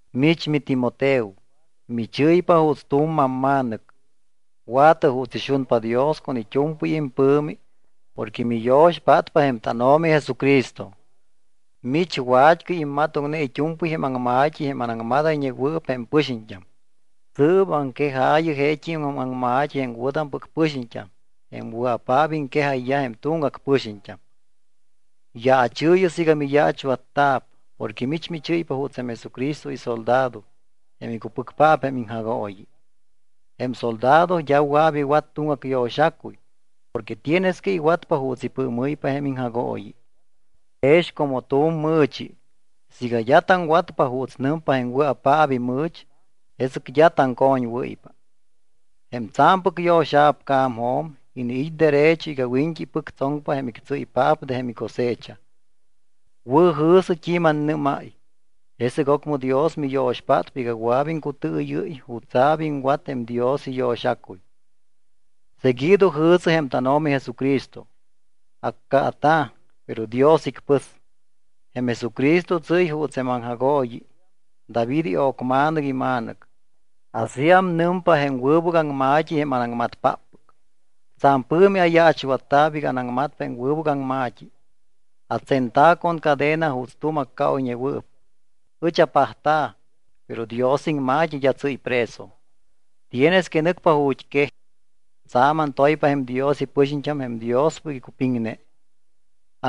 Mich miTimoteo, michɨ́ypa juuts tu̱m mamma̱nɨc. Wa̱tɨ juuts ixunpa Dios con it́u̱mpɨy impɨ̱mi porque miyo̱xpátpa jém tánO̱mi Jesucristo. Mich wa̱t́cɨy immatoŋne it́u̱mpɨy jém aŋma̱t́i jém anaŋmadayñewɨɨp jém pɨxiñt́am. Sɨɨp aŋquejaayɨ jeet́im aŋma̱t́i jém wɨ̱tampɨc pɨxiñt́am jém wɨa̱paap iŋquejayyaj jém tuŋgac pɨxiñt́am. Yaachɨɨyɨ siiga miyaachwatta̱p porque mich michɨ́ypa juuts jém Jesucristo isoldado jém icupɨcpaap jém iŋjagooyi. Jém soldado d́a wɨa̱p iwat tuŋgac yo̱xacuy porque tienes que iwatpa juuts ipɨɨmɨ́ypa jém iŋjagooyi. Jex como tu̱m mɨ̱chi, siiga d́a taŋwatpa juuts nɨmpa jém wɨa̱paap imɨ̱ch, jesɨc d́a taŋcoñwɨ́ypa. Jém tsa̱mpɨc yo̱xa̱p ca̱mjo̱m, iniit́ derecho iga wiñt́i ipɨctsoŋpa jém ictsíypaap de jém cosecha. Wɨ̱jɨ̱sɨ t́i manaŋmadáy, jesɨc ocmɨ Dios miyo̱xpátpa iga wɨa̱p iŋcutɨɨyɨ́y jutsa̱p iŋwat jém Dios iyo̱xacuy. Seguido jɨ̱sɨ jém tánO̱mi Jesucristo. Accaata̱, pero Dios icpɨs. Jém Jesucristo tsɨ́y juuts jém aŋjagooyi David io̱cma̱nɨc ima̱nɨc. Asíam nɨmpa jém wɨbɨc aŋma̱t́i jém anaŋmatpáppɨc. Tsa̱m pɨ̱mi ayaachwatta̱p iga anaŋmatpa jém wɨbɨc aŋma̱t́i. Atsenta̱ con cadena juuts tu̱m accaoyñewɨɨp. Ɨch apajta̱, pero Dios iŋma̱t́i d́a tsɨ́y preso. Tienes que nɨcpa ju̱t́quej. Tsa̱m antoypa jém Dios ipɨxiñt́am jém Diospɨc icupiŋne.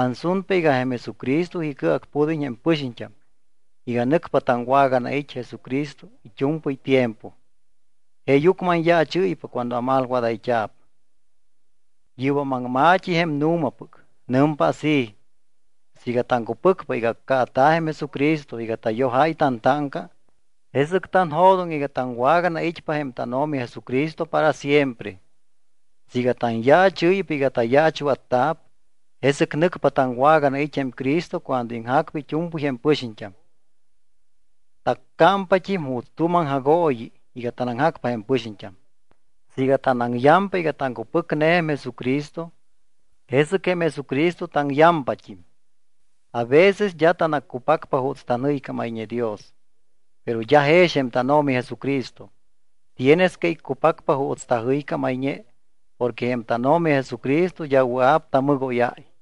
Ansunpa iga jém Jesucristo icɨacpud́iñ jém pɨxiñt́am iga nɨcpa taŋwaganait́ Jesucristo it́u̱mpɨy tiempo. Jeeyucmɨ anyaachɨ́ypa cuando amalwadayt́a̱p. Yɨ́bam aŋma̱t́i jém nu̱mapɨc. Nɨmpa así: Siiga taŋcupɨcpa iga accaata̱ jém Jesucristo iga tayojáy tantáŋca, jesɨc tanjo̱doŋ iga taŋwaganait́pa jém tánO̱mi Jesucristo para siempre. Siiga tanyaachɨ́ypa iga tayaachwatta̱p, jesɨc nɨcpa taŋwaganait́ jém Cristo cuando iŋjacpa it́u̱mpɨy jém pɨxiñt́am. Taccámta̱pt́im juuts tu̱m aŋjagooyi iga tanaŋjacpa jém pɨxiñt́am. Siiga tanaŋyampa iga taŋcupɨcne jém Jesucristo, jesɨc jém Jesucristo taŋyampat́im. A veces d́a tanaccupacpa juuts tanjɨycámayñe Dios, pero d́a jex jém tánO̱mi Jesucristo. Tienes que icupacpa juuts tajɨycámayñe porque jém tánO̱mi Jesucristo d́a wɨa̱p tamɨgóyáy.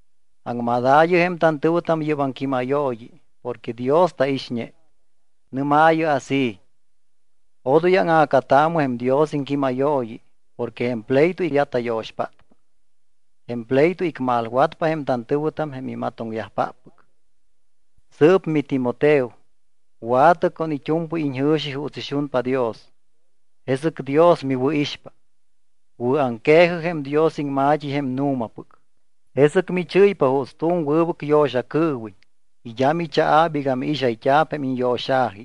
Aŋmadaayɨ jém tantɨ̱wɨtam yɨ́p aŋquímayooyi porque Dios taixñe. Nɨ́maayɨ así: “Odoy áŋa̱cataamɨ jém Dios iŋquímayooyi porque jém pleito d́a tayo̱xpátpa. Jém pleito icmalwatpa jém tantɨ̱wɨtam jém imatoŋyajpáppɨc.” Sɨɨp miTimoteo, wa̱tɨ con it́u̱mpɨy iñjɨ̱xi juuts ixunpa Dios, jesɨc Dios miwɨ̱ixpa. Wɨ̱aŋque̱jɨ jém Dios iŋma̱t́i jém nu̱mapɨc. Jesɨc michɨ́ypa juuts tu̱m wɨbɨc yo̱xacɨɨwiñ y d́a michaa̱p iga miixayt́a̱p jém iñyo̱xa̱ji.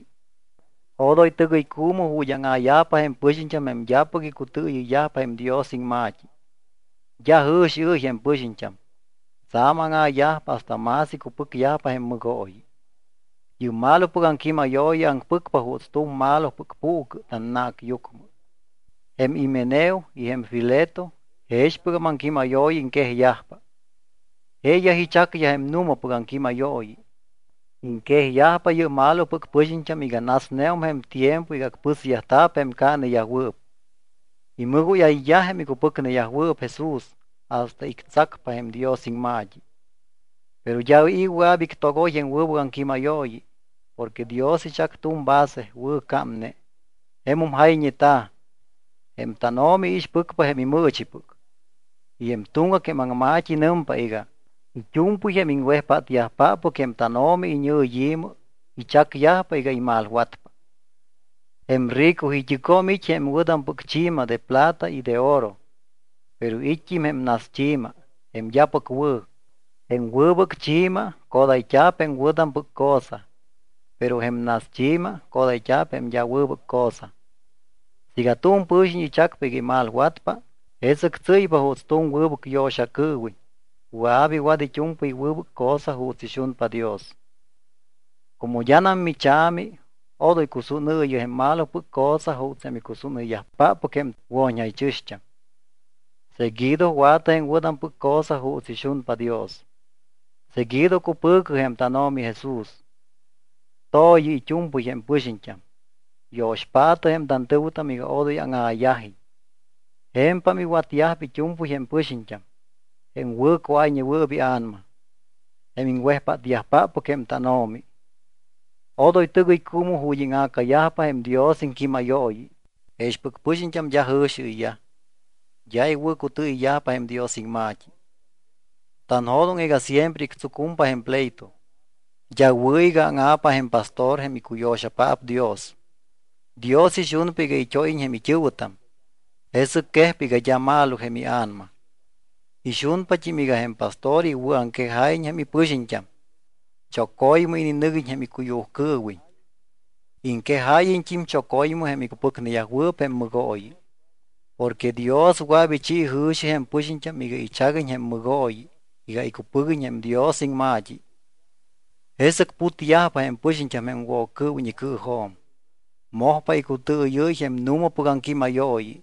Odoy tɨgɨycuumɨ ju̱t́ áŋa̱yajpa jém pɨxiñt́am jém d́apɨc icutɨɨyɨyyajpa jém Dios iŋma̱t́i. D́a jɨ̱xiɨ́y jém pɨxiñt́am, tsa̱m áŋa̱yajpa hasta más icupɨcyajpa jém mɨgooyi. Yɨ́p malopɨc aŋquímayooyi aŋpɨcpa juuts tu̱m malopɨc puucɨ tannacyucmɨ. Jém Himeneo y jém Fileto jexpɨgam aŋquímayooyi iŋquejyajpa. Jeeyaj ichacyaj jém nu̱mapɨc aŋquímayooyi. Iŋquejyajpa yɨ́p malopɨc pɨxiñt́am iga nasneum jém tiempo iga acpɨsyajta̱p jém caaneyajwɨɨp. Imɨgóyayyaj jém icupɨcneyajwɨɨp Jesús hasta ictsacpa jém Dios iŋma̱t́i. Pero d́a i̱ wɨa̱p ictogoy jém wɨbɨc aŋquímayooyi porque Dios ichac tu̱m base wɨ̱cámne. Jemum jayñeta̱: “Jém tánO̱mi iixpɨcpa jém imɨɨchipɨc.” Y jém tuŋgac jém aŋma̱t́i nɨmpa iga: “It́u̱mpɨy jém iŋwejpátyajpáppɨc jém tánO̱mi iñɨ̱yi̱mɨ, ichacyajpa iga imalwatpa.” Jém rico it́ɨcjo̱m it́ jém wɨ̱tampɨc chi̱ma de plata y de oro. Pero it́t́im jém naschi̱ma jém d́apɨc wɨ̱. Jém wɨbɨc chi̱ma codayt́a̱p jém wɨ̱tampɨc cosa, pero jém naschi̱ma codayt́a̱p jém d́a wɨbɨc cosa. Siiga tu̱m pɨ̱xiñ ichacpa iga imalwatpa, jesɨc tsɨ́ypa juuts tu̱m wɨbɨc yo̱xacɨɨwiñ wɨa̱p iwat it́u̱mpɨy wɨbɨc cosa juuts ixunpa Dios. Como d́anam micha̱mi odoy cusúnɨɨyɨ jém malopɨc cosa juuts jém icusúnɨyyajpáppɨc jém wo̱ñjaychɨ̱xt́am. Seguido wa̱tɨ jém wɨ̱tampɨc cosa juuts ixunpa Dios. Seguido cupɨ̱cɨ jém tánO̱mi Jesús. To̱yɨ it́u̱mpɨy jém pɨxiñt́am. Yo̱xpaatɨ jém tantɨ̱wɨtam iga odoy áŋa̱yajiñ. Je̱mpam iwatyajpa it́u̱mpɨy jém pɨxiñt́am, jém wɨ̱cuáyñewɨɨp ia̱nama, jém iŋwejpátyajpáppɨc jém tánO̱mi. Odoy tɨgɨycuumɨ ju̱t́ íŋa̱cayajpa jém Dios iŋquímayooyi. Jexpɨc pɨxiñt́am d́a jɨ̱xiɨyyaj, d́a iwɨ̱cutɨɨyɨyyajpa jém Dios iŋma̱t́i. Tanjo̱doŋ iga siempre ictsucumpa jém pleito. D́a wɨ̱ iga áŋa̱pa jém pastor jém icuyo̱xapaap Dios. Dios ixunpa iga it́óyiñ jém it́ɨ̱wɨtam, jesɨc quejpa iga d́a malo jém ia̱nama. Ixunpat́im iga jém pastor iwɨ̱aŋquejáyiñ jém ipɨxiñt́am, choco̱ymɨ ininɨguiñ jém icuyujcɨɨwiñ. Iŋquejáyiñt́im choco̱ymɨ jém icupɨcneyajwɨɨp jém mɨgooyi. Porque Dios wɨa̱p ichi jɨ̱xi jém pɨxiñt́am iga ichaguiñ jém mɨgooyi iga icupɨguiñ jém Dios iŋma̱t́i. Jesɨc putyajpa jém pɨxiñt́am jém Woccɨɨwiñ icɨɨjo̱m. Mojpa icutɨɨyɨ́y jém nu̱mapɨc aŋquímayooyi.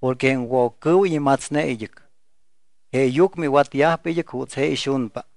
Porque jém Woccɨɨwiñ imatsne id́ɨc, jeeyucmɨ iwatyajpa id́ɨc juuts je ixunpa.